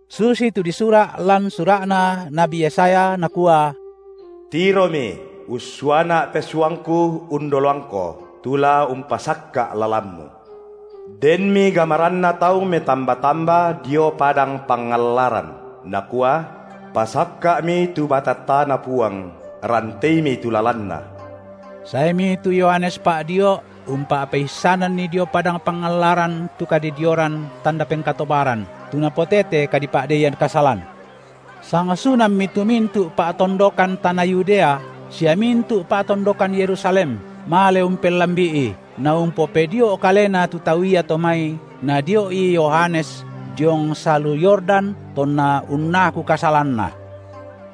Susitu disura’ lan sura’na nabi Yesaya, nakua: Tiromi, ussuaNa’ pesuangKu undoloangKo, tu la umpasakka’ lalanMu. Denmi gamaranna tau metamba-tamba dio padang pangallaran, nakua: Pasakka’mi tu batattaNa Puang, ranteimi tu lalanNa. Saemi tu Yohanes Pa’dio’ umpa’peissananni dio padang pangallaran tu kadidioran tanda pengkatobaran, tu napotete kadipa’deian kasalan. Sangsunammi tu mintu’ pa’tondokan tana Yudea sia mintu’ pa’tondokan Yerusalem male umpellambi’i, naumpopedio’ kalena tu tau iato mai nadio’i Yohanes diong salu Yordan tonna unnaku kasalanna.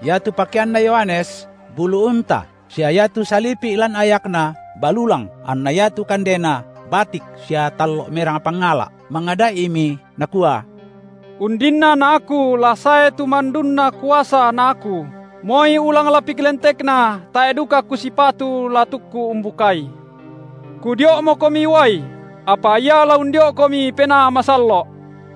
Iatu pakeanna Yohanes bulu unta sia iatu salipi’ lan ayakna balulang anna iatu kandena batik sia tallo’ merang pangala’. Mangada’imi, nakua: Undinna na aku la sae tu mandunna kuasa na aku, moi ulang lapik lentekNa tae’ duka kusipatu la tukku umbukai. Kudio’mokomi uai, apa Ia la undio’komi Penaa Masallo’.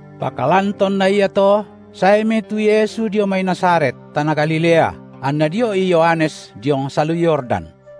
Pakalan tonna iato saemi tu Yesu dio mai Nazaret, tana Galilea, anna dio’I Yohanes diong salu Yordan.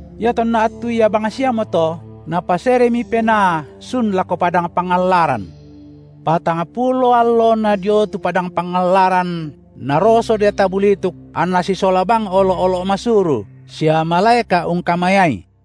Iatonna attu ia bangsiamoto Napaseremi Penaa sun lako padang pangallaran. Patangpulo allona dio tu padang pangallaran naroso deata bulituk anNa sisola bang olo’-olo’ masuru, sia malaeka’ ungkamayai.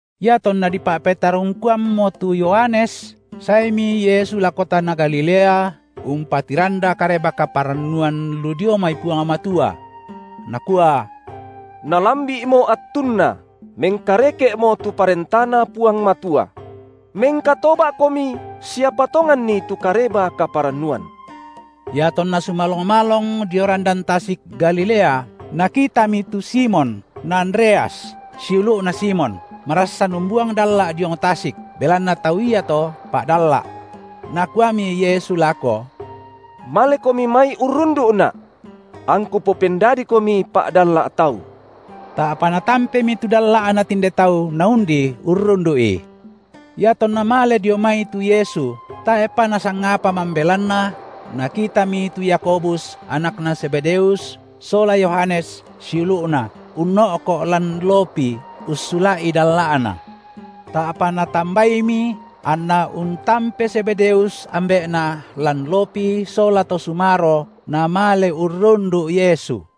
Iatonna dipa’petarungkuammo tu Yohanes, saemi Yesu lako tana Galilea umpatiranda kareba kaparannuan lu dio mai Puang Matua. Nakua: Nalambi’mo attunna, mengkareke’mo tu ParentaNa Puang Matua. Mengkatoba’komi sia patonganni tu Kareba kaparannuan. IatonNa sumalong-malong dio randan tasik Galilea, Nakitami tu Simon na Andreas, siulu’na Simon, marassan umbuang dalla’ diong tasik, belanna tau iato pa’dalla’. Nakuami Yesu lako: Malekomi mai urrundu’Na’, angKu popendadikomi pa’dalla’ tau. Ta’pa natampemi tu dalla’na tinde tau naundi urrundu’I. Iatonna male dio mai tu Yesu tae’pa nasangapa mambelanna, Nakitami tu Yakobus, anakna Zebedeus sola Yohanes, siulu’na, unno’ko’ lan lopi ussula’i dalla’na. Ta’pa Natambaimi, anna untampe Zebedeus, ambe’na lan lopi sola to sumaro namale urrundu’ Yesu.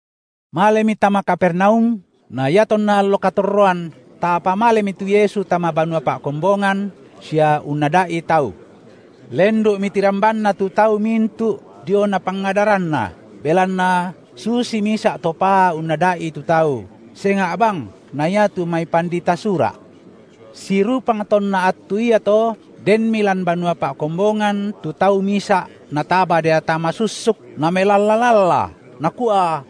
Malemi tama Kapernaum, na iatonna allo katorroan, ta’pa malemi tu Yesu tama banua pa’kombongan sia unnada’i tau. Lendu’mi tirambanna tu tau mintu’ diona pangadaranNa, belanna susi misa’ to paa unnada’i tu tau, senga’ bang na iatu mai pandita Sura’. Sirupang tonna attu iato denmi lan banua pa’kombongan tu tau misa’ nataba deata masussuk, namelalla-lalla, nakua: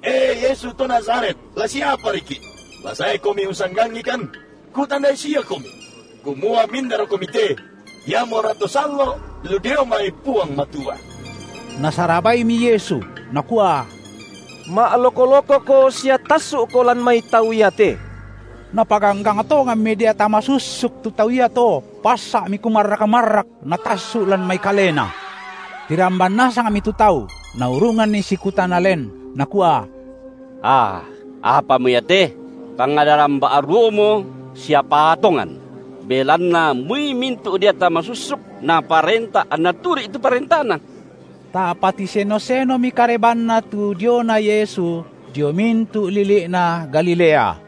E, Yesu to Nazaret, la siapariki’! La saeKomi ussanggangikan. Kutandai siaKomi, kumua mindaraKomi te, iamora To Sallo’ lu dio mai Puang Matua. Nasarabaimi Yesu, Nakua: Ma’loko-lokoko sia tassu’ko lan mai tau iate! Napaganggang tonganmi deata masussuk tu tau iato, bassa’mi kumarrak-marrak natassu’ lan mai kalena. Tiramban nasangmi tu tau, naurunganni sikutana len, nakua: Aa, apamo ia te? Pangadaran ba’ruomo sia paa tongan! Belanna moi mintu’ deata masussuk Naparenta anna turu’i tu parentaNa. Ta’pa tiseno-senomi karebanna tu diona Yesu dio mintu’ lili’na Galilea.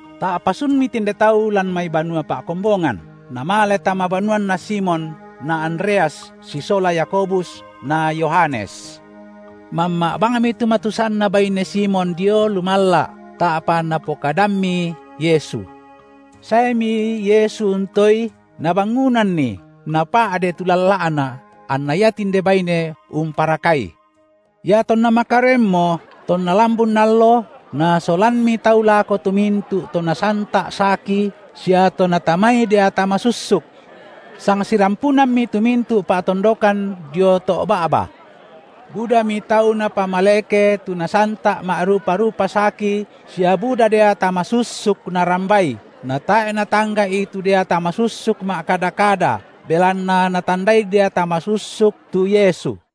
Ta’pa sunmi tinde tau lan mai banua pa’kombongan, namale tama banuanna Simon na Andreas sisola Yakobus na Yohanes. Mamma’ bangmi tu matusanna baine Simon dio lumalla’, ta’pa napokadammi Yesu. Saemi Yesu untoei, Nabangunanni, napa’de tu lalla’na anna ia tinde baine umparakai. Iatonna makaroenmo tonna lambun allo, nasolammi tau lako tu mintu’ to nasanta’ saki sia to natamai deata masussuk. Sang sirampunammi tu mintu’ pa’tondokan dio to’ ba’ba. Budami tau Napamaleke tu nasanta’ ma’rupa-rupa saki sia buda deata masussuk Narambai, natae’ Natangga’i tu deata masussuk ma’kada-kada belanna natandai deata masussuk tu Yesu.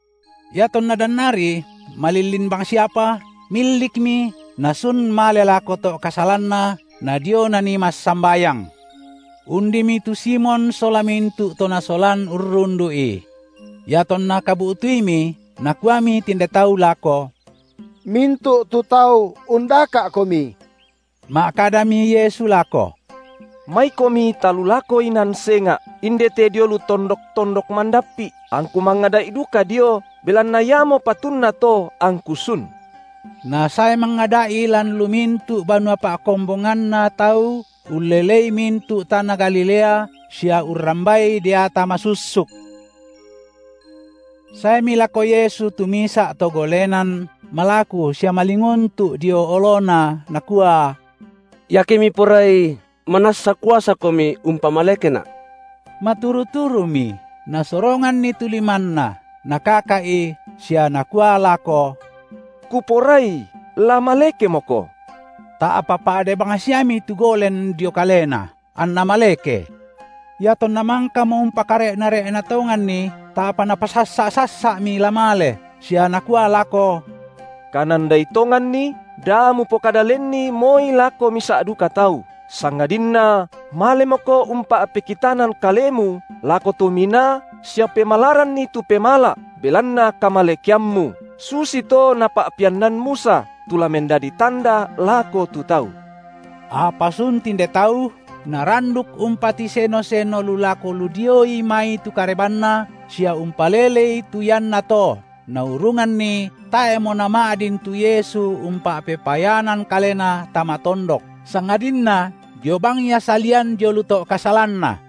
Iatonna dannari malillin bangsiapa, millikmi Nasun male lako to’ kasalanna nadio Nanii massambayang. Undimi tu Simon sola mintu’ to nasolan urrundu’I. Iatonna kabu’tuimi, nakuami tinde tau lako: Mintu’ tu tau undaka’Komi. Ma’kadami Yesu lako: Maikomi talulako inan senga’, indete dio lu tondok-tondok mandappi’, angKu mangada’i duka dio, belanna iamo patunna to angKu sun. Nasae mangada’i lan lu mintu’ banua pa’kombonganna tau ullelei mintu’ tana Galilea sia urrambai deata masussuk. Saemi lako Yesu tu misa’ to golenan malaku sia malinguntu’ dio oloNa, nakua: Iake Miporai, manassa kuasaKomi umpamalekena’. Maturu-turumi, Nasoronganni tu limanNa, Nakaka’i sia Nakua lako: Kuporai la malekemoko! Ta’pa pa’de bangsiami tu golen dio kalena, anna maleke. Iatonna mangkamo umpakare’na-re’na tonganni, ta’pa Napasassa’-sassa’mi la male, sia Nakua lako: Kanandai tonganni, da mupokada lenni moi lako misa’ duka tau, sangadinna malemoko umpa’pekitanan kalemu lako to minaa sia pemalaranni tu pemala’ belanna kamalekeammu, susito napa’peannan Musa, tu la mendadi tanda lako tu tau. Apa sun tinde tau, naranduk umpatiseno-seno lu lako lu dioi mai tu karebanNa sia umpalelei tu iannato, naurunganni tae’mo nama’din tu Yesu umpa’pepayanan Kalena tama tondok sangadinna dio bang Ia salian dio lu to’ kasalanna.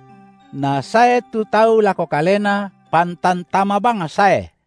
Nasae tu tau lako Kalena pantan tama bang sae.